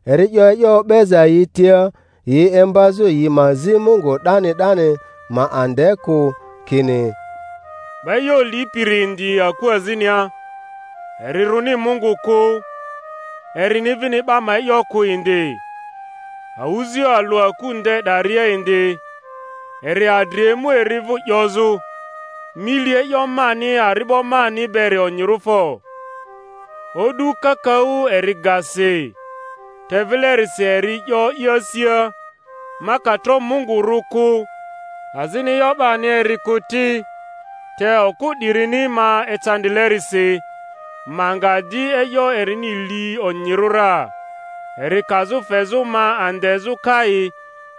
Eri 'yo e'yo o'beza yi tia, yi imbazᴜ yi ma zi Mungu 'dani 'dani, ma ande kᴜ; kini, 'Ba e'yo lipiri indi aku azinia, eri rᴜni Mungu kᴜ, erini vini 'ba ma e'yo kᴜ indi; awᴜzioᴜ alᴜ aku nde 'daria indi, eri adri emu eri vᴜ 'yozᴜ, Mi li e'yo mani ari'bo mani beri onyirᴜ fo! O'du kakaᴜ eri ga si; te vilerisi eri 'yo i asia, Ma ka tro Mungu rᴜ kᴜ, azini e'yo 'bani eri kᴜ ti, te okᴜ 'dirini ma ecandilerisi, ma nga di e'yo erini li onyirᴜ ra, eri kazᴜ fezᴜ ma andezᴜ kai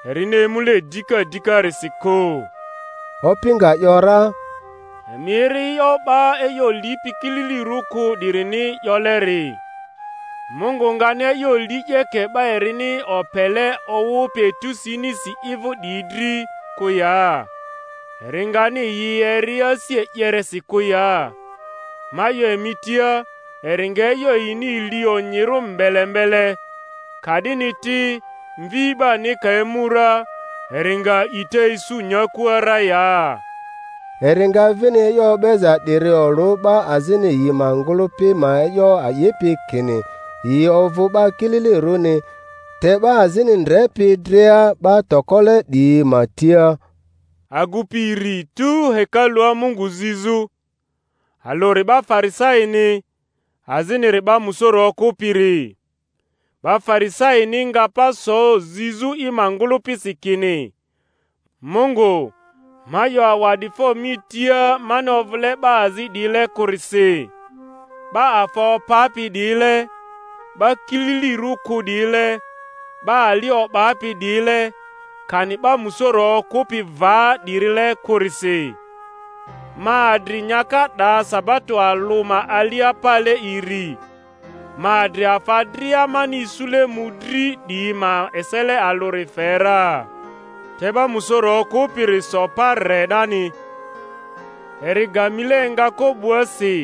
erini emule dika dikarisi kᴜ. Opi nga ‘yora, Emi eri e'yo 'ba e'yo lipi kililirᴜ kᴜ 'dirini 'yoleri. Mungu ngani e'yo li 'yeke 'ba erini opele owᴜpi etusi inisi i vᴜ 'diyi dri kᴜ ya? Eri ngani yi eri asi e'yeresi kᴜ ya? Ma 'yo emi tia, eri nga e'yo yini li onyirᴜ mbele mbele. Ka'dini ti, Mvi 'bani ka emu ra, eri nga a'ita isu nyakua ra ya? Eri nga vini e'yo o'beza 'diri olᴜ 'ba azini yi ma ngᴜlᴜpi ma e'yo a'ipi kini yi ovᴜ 'ba kililirᴜni, te 'ba azini ndrepi dria 'ba tokole 'diyi ma tia: Agupi iri tu hekalua Mungu zizᴜ, alᴜri 'ba Farisaini, aziniri 'ba musoro okᴜpiri. 'Ba Farisaini nga pa so zizᴜ i ma ngᴜlᴜpisi kini, Mungu, ma 'yo awa'difo mi tia mani ovᴜle 'ba azi 'diyile kᴜrisi, 'ba afa opapi 'diyile, 'ba kililirᴜ kᴜ 'diyile, 'ba ali o'bapi 'diyile, kani 'ba musoro okᴜpi va 'dirile kᴜrisi. Ma adri nyaka 'da sabato alᴜ ma alia pale iri; ma adri afa dria mani isule mᴜdri 'diyi ma esele alᴜri fe ra. Te 'ba musoro okᴜpiri so pa re 'dani, eri ga mile engako 'bua si,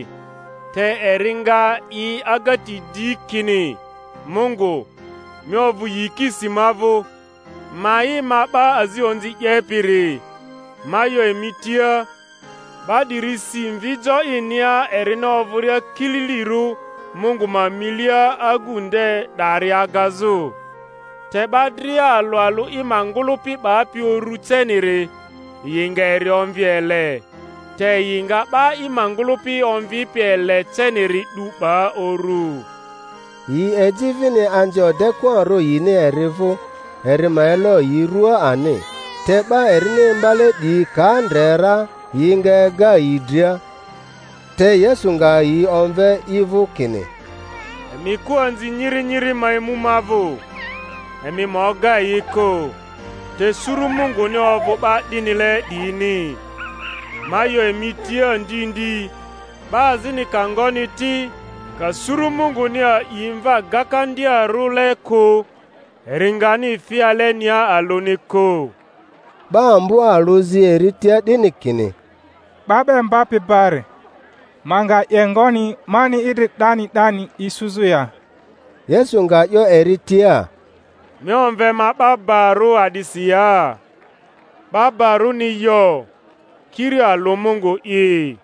te eri nga i agati di, kini, Mungu, mi ovᴜ yikisi ma vᴜ, ma'i ma 'ba azi onzi 'yepiri! Ma 'yo emi tia, 'ba 'diri si mvi jo inia erini ovᴜria kililirᴜ Mungu ma milia agu nde 'dari agazᴜ; te 'ba dria alᴜ alᴜ i ma ngᴜlᴜpi 'bapi urᴜ ceniri, yi nga eri omvi ele; te yi nga 'ba i ma ngᴜlᴜpi omvipi ele ceniri 'du 'ba uru. Yi eji vini anzi odekᴜarᴜ yini eri vᴜ, eri ma elo yi rua ani; te 'ba erini imbale 'diyi ka ndre ra, yi nga ega yi dria. Te Yesu nga yi omve i vᴜ, kini, Emi kᴜ anzi nyiri nyiri ma emu ma vᴜ, emi ma oga yi kᴜ; te suru Munguni ovᴜ 'ba 'dinile 'diyini. Ma 'yo emi tia ndi ndi, 'ba azini ka ngoni ti, ka suru Munguni a'i mva gakandiarᴜle kᴜ, eri ngani fi alenia alᴜni kᴜ. 'Ba ambo alᴜ zi eri tia 'dini kini, 'Ba 'ba Imbapi bari, ma nga 'ye ngoni mani idri 'dani 'dani isuzᴜ ya? Yesu nga 'yo eri tia, Mi omve ma 'ba barᴜ a'disi ya? 'Ba ba-rᴜni yo, kiri alᴜ Mungu'i.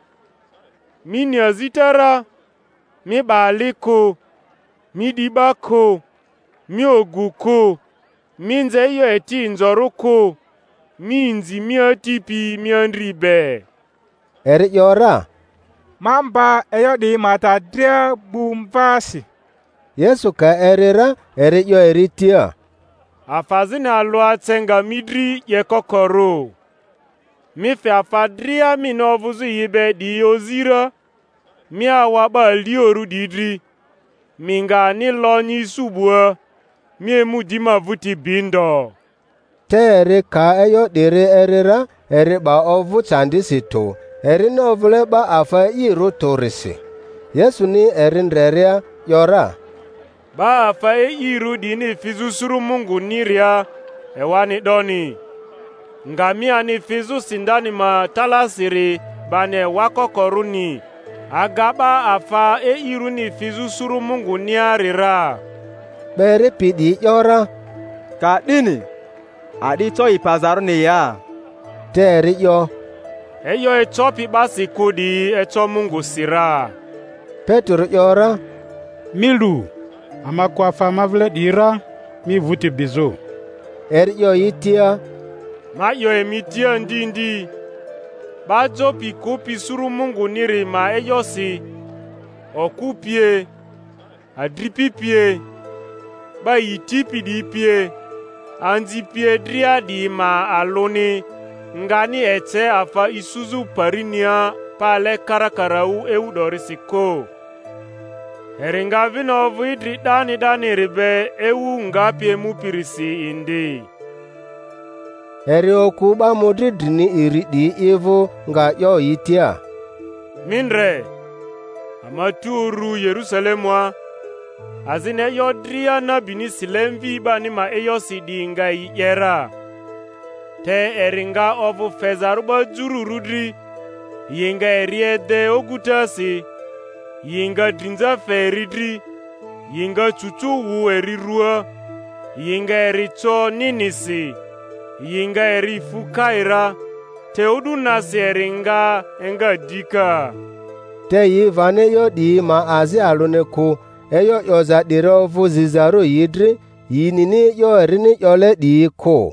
Mi ni azita ra: Mi 'ba ali kᴜ, Mi 'di 'ba kᴜ, Mi ogu kᴜ, Mi nze e'yo eti inzorᴜ kᴜ, Mi inzi mi ati pi mi andri be. Eri ‘yora, Ma mba e'yo 'diyi ma ta dria gbu mvaasi. Yesu ka eri ra, eri 'yo eri tia, Afa azini alᴜ ece nga mi dri 'yekokorᴜ. Mi fe afa dria mini ovᴜzᴜ yi be 'diyi ozi ra, mi awa 'ba aliorᴜ 'diyi dri, mi nga ani lonyi isu 'bua; mi emu di ma vᴜti bi ndo. Te eri ka e'yo 'diri eri ra, eri 'ba ovᴜ candisi tᴜ, erini ovᴜle 'ba afa e'irᴜ tᴜrisi. Yesuni eri ndreria ‘yora, Ba afa e'irᴜ 'diyini fizᴜ suru Mungᴜni-ria ewani 'doni! Ngamiani fizᴜ sindani ma talaasiri bani ewa ko-korᴜni aga 'ba afa e'irᴜni fizᴜ suru Munguniari ra. 'Ba eripi 'diyi ‘yora, Ka'dini a'di eco i pazarᴜni ya? Te eri 'yo, E'yo ecopi 'basi kᴜ 'diyi eco Mungusi ra. Petero ‘yora, Mi lu, ama kᴜ afa ama vile 'diyi ra, mi vᴜti bizᴜ. Eri 'yo yi tia, Ma 'yo emi tia ndi ndi, 'ba jo pi kᴜpi suru Munguniri ma e'yosi, okᴜ pie, adripi pie, 'ba yi tipi 'diyi pie, anzi pie dria 'diyi ma alᴜni ngani ece afa isuzᴜ parinia pale karakaraᴜ ewu 'dorisi kᴜ, eri nga vini ovᴜ idri 'dani 'daniri be ewu ngapi emupirisi indi. Eri okᴜ 'ba mᴜdri drini iri 'diyi i vᴜ, nga 'yo yi tia, Mi ndre, ama tu urᴜ Yerusalemua, azini e'yo dria nabini sile Mvi 'bani ma e'yosi 'diyi nga yi 'ye ra. Te eri nga ovᴜ fezarᴜ 'ba jururᴜ dri, yi nga eri ede ogutasi, yi nga drinza fe eri dri, yi nga cucu wᴜ eri ruaa; yi nga eri co ninisi, yi nga eri fu kai ra, te o'du nasi eri nga enga dika. Te yi vani e'yo 'diyi ma azi alᴜni kᴜ; e'yo 'yoza 'diri ovᴜ zizarᴜ yi dri, yi nini e'yo erini 'yole 'diyi kᴜ.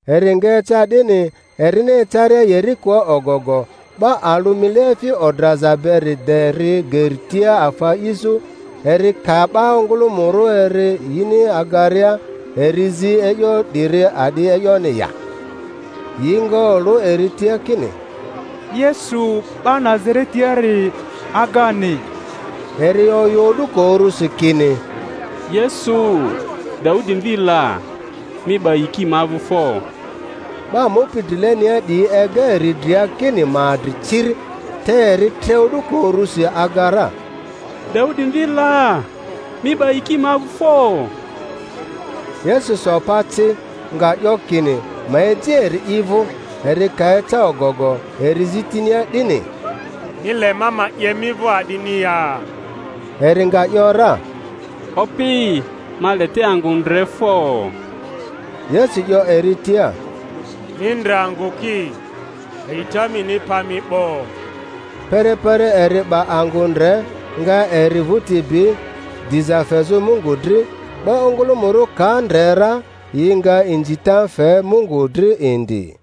Eri nga eca 'dini, erini ecaria Yerikoa ogogo, 'ba alᴜ mileefi odraza beri de ri geri tia afa a'izᴜ; eri ka 'ba ongᴜlᴜmᴜrᴜ eri yini agaria, eri zi e'yo 'diri a'di e'yoni ya. Yi nga olᴜ eri tia, kini, Yesu 'ba Nazaretiari agani. Eri oyᴜ o'duko urusi kini, Yesu, Daudi mvi la, mi 'ba yiki ma vᴜ fo! 'Ba mupi drilenia 'diyi ega eri dria kini ma adri ciri; te eri tre o'duko urusi aga ra, Daudi mvi la, mi 'ba yiki ma vᴜ fo! Yesu so pa ci, nga 'yo kini ma eji eri i vᴜ; eri ka eca ogogo, eri zi tinia 'dini, Mi le ma ma 'ye mi vᴜ a'dini ya? Eri nga ‘yora, Opi, ma le te angᴜ ndre fo! Yesu 'yo eri tia, Mi ndre angᴜ ki! A'ita mini pa mi 'bo. Perepere eri 'ba angᴜ ndre, nga eri vᴜti bi, diza fezᴜ Mungu dri; 'ba ongᴜlᴜmᴜrᴜ ka ndre ra, yi nga inzita fe Mungu dri indi.